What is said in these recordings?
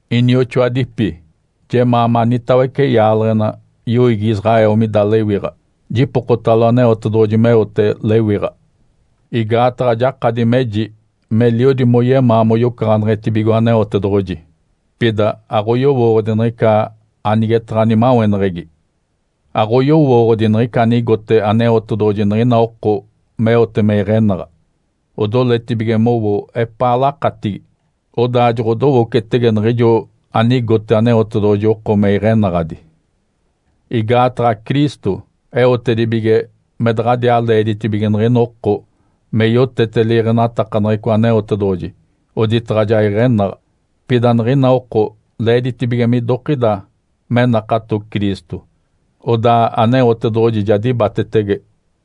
Inioxoadipi. Jemaa manitawece yaaleɡ̶ena, yoiigi Israel mida lewiɡ̶a. Jipokotalo Aneotedoɡ̶oji meote lewiɡ̶a. Igaataɡ̶a jakadi meji meliodi moyemaa moyocaɡ̶aneɡ̶etibigo Aneotedoɡ̶oji, pida aɡ̶oyowooɡ̶odi niɡ̶ica anigetaɡ̶a nimaweneɡ̶egi. Aɡ̶oyowooɡ̶odi niɡ̶ica anigote Aneotedoɡ̶oji niɡ̶ina oko meote me iɡ̶enaɡ̶a. Odoletibige mowo epaa lakatigi, odaa joɡ̶odowocetege niɡ̶ijo anigote Aneotedoɡ̶oji oko me iɡ̶enaɡ̶adi. Igaataɡ̶a Cristo eotedibige me daɡ̶adiaa leeditibige niɡ̶ina oko me yotete liiɡ̶enatakaneɡ̶eco Aneotedoɡ̶oji oditaɡ̶a ja iɡ̶enaɡ̶a. Pida niɡ̶ina oko leeditibige midokida me nakato Cristo, odaa Aneotedoɡ̶oji ja dibatetege.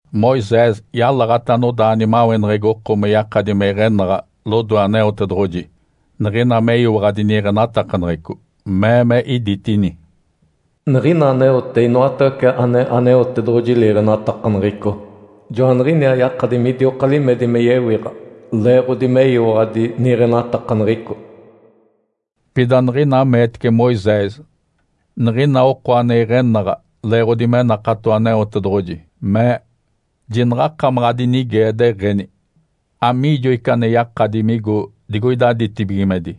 Moisés yalaɡ̶ata anodaa nimaweneɡ̶egi oko me yakadi me iɡ̶enaɡ̶a lodoe Aneotedoɡ̶oji, niɡ̶ina meyiwaɡ̶adi niiɡ̶enatakaneɡ̶eco. Mee me iditini, “Niɡ̶ina aneote inoatawece ane Aneotedoɡ̶oji liiɡ̶enatakaneɡ̶eco, joaniɡ̶iniaa yakadi midioka limedi me yewiɡ̶a leeɡ̶odi meyiwaɡ̶adi niiɡ̶enatakaneɡ̶eco.” Pida niɡ̶ina meetece Moisés niɡ̶ina oko ane iɡ̶enaɡ̶a leeɡ̶odi me nakato Aneotedoɡ̶oji, mee, “Jinaɡ̶akamaɡ̶a adinigee, deɡ̶eni, ‘Amiijo ica ane yakadi migo digoida ditibigimedi?’”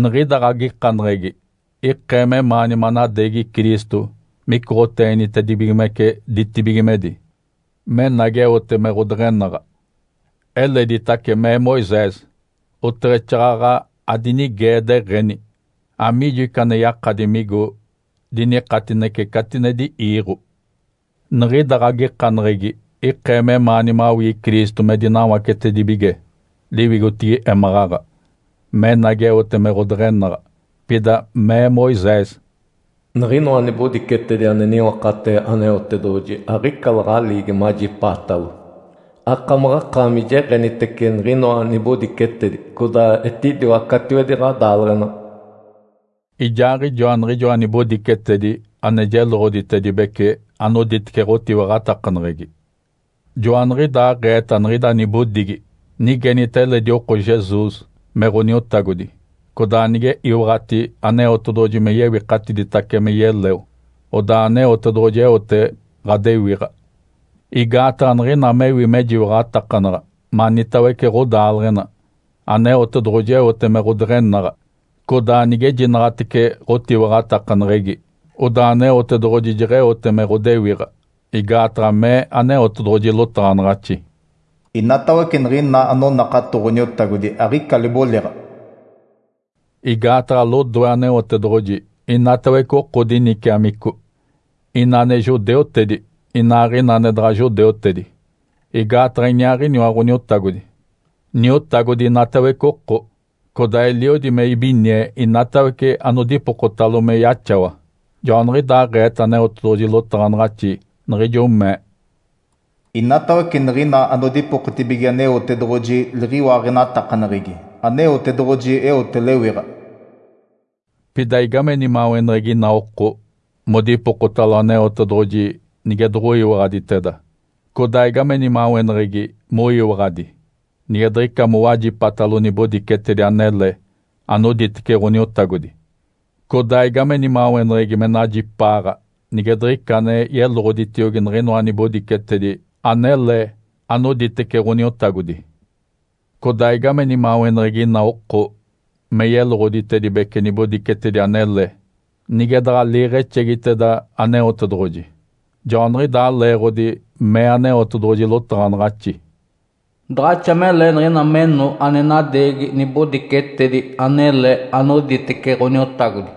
Niɡ̶ida ɡ̶agikaneɡ̶egi ikee memaani manadeegi Cristo micoɡ̶oteenitedibigimece ditibigimedi, menagi eote me ɡ̶odeɡ̶enaɡ̶a. Eleditace mee Moisés, “Oteɡ̶exaaɡ̶aɡ̶a adinigee, deɡ̶eni ‘Amiijo ica ane yakadi migo dinikatinece catinedi iiɡ̶o?’” Niɡ̶ida ɡ̶agikaneɡ̶egi ikee memaani mawii Cristo me dinawacetedibige liwigotigi émaɡ̶aɡ̶a, menagi eote me ɡ̶odeɡ̶enaɡ̶a. Pida mee Moisés, “Niɡ̶inoa nibodicetedi ane niwakatee Aneotedoɡ̶oji aɡ̶ica laɡ̶aliigi majipaatalo. Akamaɡ̶akaami jeɡ̶enitece niɡ̶inoa nibodicetedi, codaa etidiwa catiwedi ɡ̶adaaleɡ̶ena.” Ijaaɡ̶ijoa niɡ̶ijoa nibodicetedi ane jeloɡ̶otaɡ̶atedibece anoditece ɡ̶otiwaɡ̶atakaneɡ̶egi. Joaniɡ̶idaaɡ̶eeta niɡ̶ida nibodigi: Nigenita eledi oko Jesus me Ǥoniotagodi, codaa nige iwaɡ̶ati Aneotedoɡ̶oji me yewikatiditace me yeleo, odaa Aneotedoɡ̶oji eote ɡ̶adewiɡ̶a. Igaataɡ̶a niɡ̶ina mewi mejiwaɡ̶atakanaɡ̶a manitawece ɡ̶odaaleɡ̶ena, Aneotedoɡ̶oji eote me ɡ̶odeɡ̶enaɡ̶a, codaa nigejinaɡ̶atece ɡ̶otiwaɡ̶atakaneɡ̶egi, odaa Aneotedoɡ̶oji jeɡ̶eote me ɡ̶odewiɡ̶a. Igaataɡ̶a mee Aneotedoɡ̶oji lotaɡ̶anaɡ̶axi, “Inatawece niɡ̶ina anonakato Ǥoniotagodi aɡ̶ica liboliɡ̶a.” Igaataɡ̶a lodoe Aneotedoɡ̶oji inatawece oko diniciamico, ina ane judeutedi, inaaɡ̶ina ane daɡ̶a judeutedi. Igaataɡ̶a iniaaɡ̶iniwa Ǥoniotagodi, Niotagodi inatawece oko. Codaa eliodi me ibinie inatawece anodipokotalo me yaxawa. Joaniɡ̶idaaɡ̶eeta Aneotedoɡ̶oji lotaɡ̶anaɡ̶axi, niɡ̶ijo mee, “Inatawece niɡ̶ina anodipokotibige Aneotedoɡ̶oji liɡ̶iwaaɡ̶enatakaneɡ̶egi, Aneotedoɡ̶oji eote lewiɡ̶a.” Pida igame nimaweneɡ̶egi ina oko modipokotalo Aneotedoɡ̶oji nige doɡ̶oyiwaɡ̶aditeda? Codaa igame nimaweneɡ̶egi moyiwaɡ̶adi, nige diɡ̶ica mowajipatalo nibodicetedi anele anoditece Ǥoniotagodi? Codaa igame nimaweneɡ̶egi me najipaaɡ̶a, nige diɡ̶ica ane yeloɡ̶oditiogi niɡ̶inoa nibodicetedi anele anoditece Ǥoniotagodi? Codaa igame nimaweneɡ̶egi ina oko me yeloɡ̶oditedibece nibodicetedi anele nige daɡ̶a liiɡ̶exegiteda Aneotedoɡ̶oji? Joaniɡ̶idaa leeɡ̶odi mee Aneotedoɡ̶oji lotaɡ̶anaɡ̶axi, “Daɡ̶axa mele niɡ̶ina meno ane nadeegi nibodicetedi anele anoditece Ǥoniotagodi.”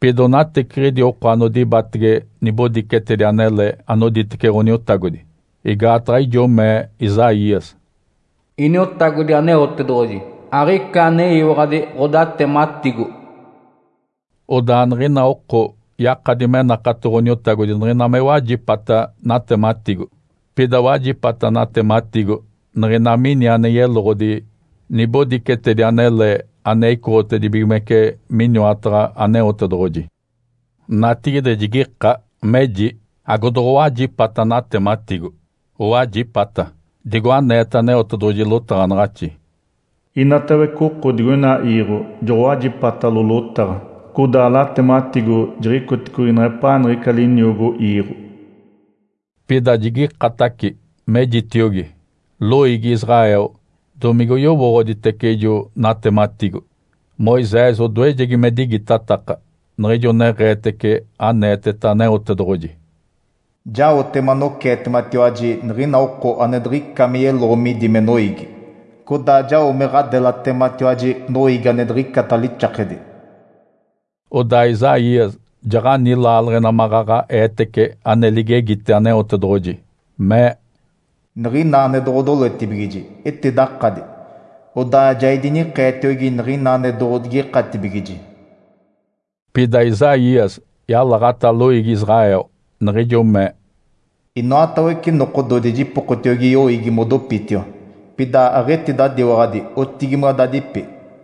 Pida onateciɡ̶idi oko anodibatege nibodicetedi anele anoditece Ǥoniotagodi. Igaataɡ̶a ijo mee Isaías, “Iniotagodi Aneotedoɡ̶oji. Aɡ̶ica aneyiwaɡ̶adi ɡ̶odatematigo.” Odaa niɡ̶ina oko yakadi me nakato Ǥoniotagodi niɡ̶ina me wajipata natematigo. Pida wajipata natematigo niɡ̶ina mini ane yeloɡ̶odi nibodicetedi anele ane icoɡ̶otedibigimece miniwataɡ̶a Aneotedoɡ̶oji. Natigide jigika, meji, “Agodoɡ̶owajipata natematigo?” Owajipata! Digo aneeta Aneotedoɡ̶oji lotaɡ̶anaɡ̶axi, “Inatawece oko digoina iiɡ̶o joɡ̶owajipatalo lotaɡ̶a, codaa latematigo jiɡ̶icoticogi neɡ̶epaa niɡ̶ica liniogo iiɡ̶o.” Pida jigikataci, mejitiogi, “Loiigi Israel, domigoyowooɡ̶oditece ijo natematigo?” Moisés odoejegi me digitataka niɡ̶ijo neɡ̶eetece aneeteta Aneotedoɡ̶oji, “Jaote manoceetematiwaji niɡ̶ina oko ane diɡ̶ica me yeloɡ̶o midi me noiigi. Codaa jao me ɡ̶adelatematiwaji noiigi ane diɡ̶icata lixakedi.” Odaa Isaías jaɡ̶ani laaleɡ̶ena maɡ̶aɡ̶a eetece ane ligegite Aneotedoɡ̶oji, mee, “Niɡ̶ina ane doɡ̶odoletibigiji, etidakadi. Odaa ja idinikeetiogi niɡ̶ina ane doɡ̶odigikatibigiji.” Pida Isaías yalaɡ̶ata loiigi Israel, niɡ̶ijo mee, “Inoatawece nokododi jipokotiogi yoiigi modopitiwa. Pida aɡ̶etidadiwaɡ̶adi, otigimadadipi.”